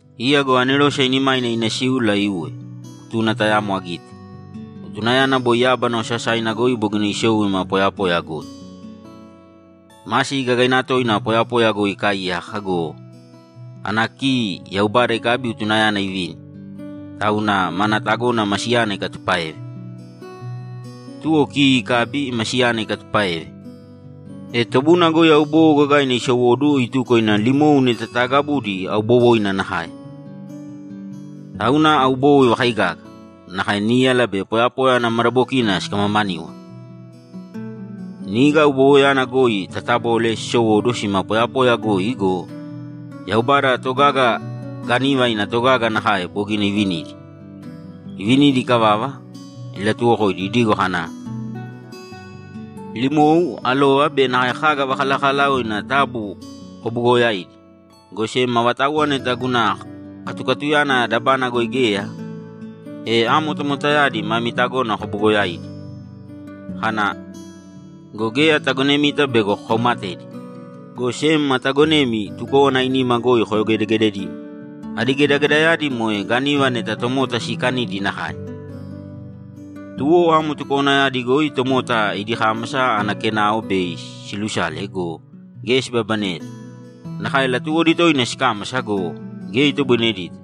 Iya go anerose ainimaina ina síula iuwe, utuna tayamo agite; utunayana boi yábana osasaina goi bogina isou ima poyapoya goi. Masi gagaina toina poyapoya goi ikaaiyaka go, ana ki Yaubada ikabi utunayana ivini, tauna mana tagona masiyana ikatupáeve. Tuwo ki ikabi masiyana ikatupáeve, e tobuna goi aubowo gagaina isowóduwo ituko ina limou neta taagabudi aubowoina nakae. Tauna aubowo ivakaigaga, nakae níyala be poyapoya ana madabokina sikamamaníwana. Niga aubowoyana goi tatabole sisowóduwo sima poyapoya goi go, Yaubada togaga gániva ina togaga nakae bogina ivinidi. Ivinidi ikavava, ilatuwokoidi idigo kana, ‘Limou, alova be nakae kaga vakalakalaoina taabu kobuugoyāidi, go sem avatauwa neta guna katukatuyana dabana goi geya, e amo tomotayadi mami tagona kobugoyaidi.’ Kana, ‘Go geya atagonemita bego kokaumatedi, go sem atagonemi tukówana ainima goi koyogedegededimo.’ Adi gedagedayadi moe gániva neta tomota siikanidi nakae. Tuwo amo tukowanayadi goi tomota idi kámasa ana kenao bei silusale go, geya sibabaneyeta. Nakae latuwodi toina sikámasa go, geya itoboinedita.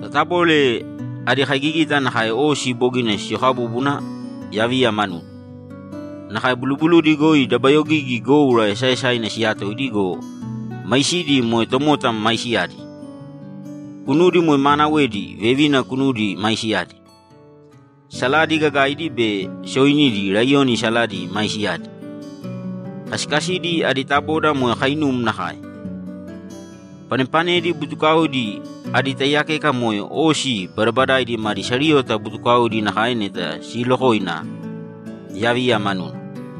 Tatabole adi kaigigita nakae osi bogina siyokabúbuna yaviya manuna. Nakae bulubuludi goi dabayogigi goura esaaesaina siyatoidi go, maisidi moe tomota maisiyadi. Kunudi moe maanawedi vevina kunudi maisiyadi. Saladi gagaidi be sooinidi laiyoni saladi maisiyadi. Kasikasidi adi taboda moe kainum nakae. Panepanedi butukaodi adi taiyakeka moe osi badabadaidi madi sariyota butukaodi nakae neta siilokoina yaviya manuna.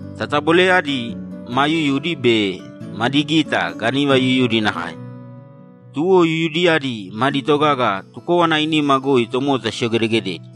Tataboleyadi maa yuyudi be madi gita gániva yuyudi nakae, tuwo yuyudiyadi madi togaga tukówana ainima goi tomota siyogedegededi.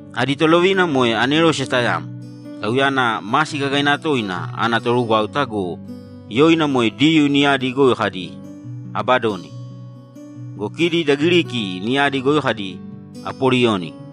Adi tolovina moe anerose tayamo, tauyana masi gagaina toina ana torugwáuta go, yoina moe Diyuu niyadi goi kadi, ‘Abadoni.’ Go kidi da Giriki niyadi goi kadi, ‘Apoliyoni.’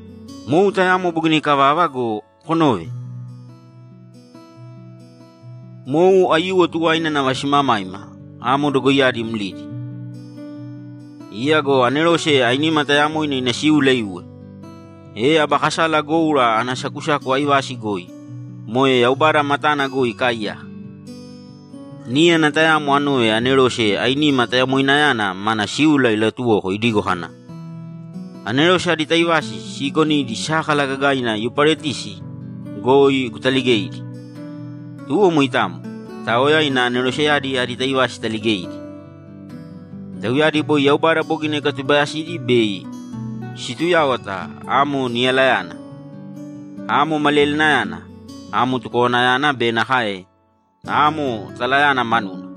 Mou tayamo bogina ikavava go, konōve! Mou aiyuwo tuwaina nava simamaima amo dogoiyadi mlidi. Iya go anerose ainima tayamoina ina síula iuwe, e aba kasala goura ana sakusaku aivasi goi, moe Yaubada matana goi ikaaiyaka, níyana tayamo anove anerose ainima tayamoinayana mana síula ilatuwoko idigo kana, ‘Anerose adi taivasi siikonidi sákala gagaina Yuparetisi goi kutaligēidi.’ Tuwo moitamo, itaoya ina aneroseyadi adi taivasi italigeidi. Tauyadi boi Yaubada bogina ikatubayasidi bei situyáwata amo niyalayana, amo maliyalinayana, amo tukowanayana be nakae amo talayana manuna.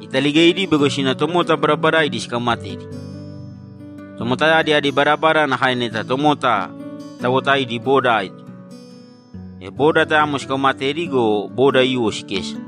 Italigeidi bego sina tomota badabadaidi sikaumatedi. Tomotayadi adi badabada nakae neta tomota tawotaidi boda aito, e boda tayamo sikaumatedi go, boda aiyuwo sikesa.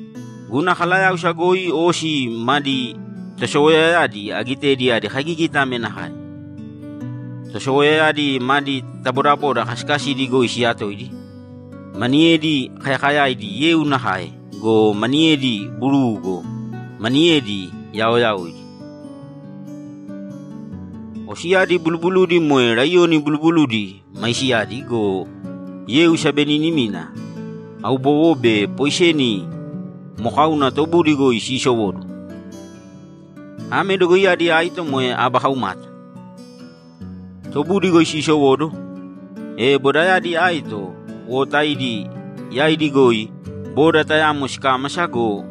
Guna kalayáusa goi osi madi tosowoyayaoyadi agitedi adi kaigigita ame nakae: Tosowoyayadi madi tabodaboda kasikasidi goi siyatoidi, maniyedi kayakayaidi yeu nakae go, maniyedi buruu go, maniyedi yaoyaoidi. Osiyadi bulubuludi moe laiyoni bulubuludi maisiyadi go, yeu sabeninimina, aubowo be poiseni mokauna tobudi goi siisowóduwo. Ame dogoiyadi aito moe aba kaumata. Tobudi goi siisowóduwo, e bodayadi aito wotaidi yaidi goi boda tayamo sikámasa go,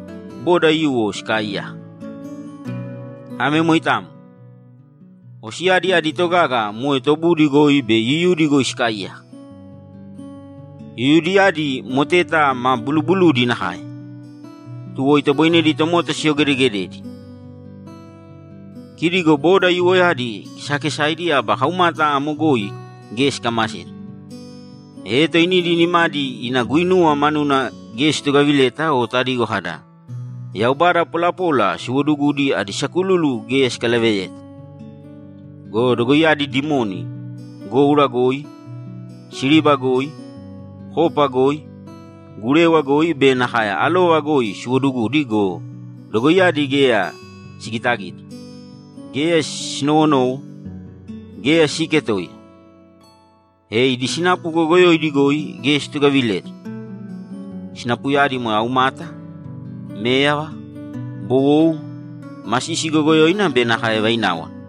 boda aiyuwo sikaaiyaka. Ame moitamo. Osiyadi idi togaga moe tobudi goi be yuyudi goi sikaaiyaka. Yuyudiyadi moteta ma bulubuludi nakae, tuwo itoboinedi tomota siyogedegededi. Kidi go boda aiyuwoyadi kesakesaidi aba kaumata amo goi geya sikamaseta, e toinidi nimadi ina guinuwa manuna geya situgavileta o tadigo kada, ‘Yaubada polapola siwoodugudi adi sakululu geya sikalaveyeta.’ Go dogoiyadi dimoni! Goura goi, siriba goi, kopa goi, gurewa goi be nakae alova goi siwodugudi go, dogoiyadi geya sigitagita, geya sinowonowo, geya siiketoiya. E idi sinapu goyogoyoidi goi geya situgavileta. Sinapuyadi moe aumata, méyava, bowou, masisi goyogoyoina be nakae vaináwana.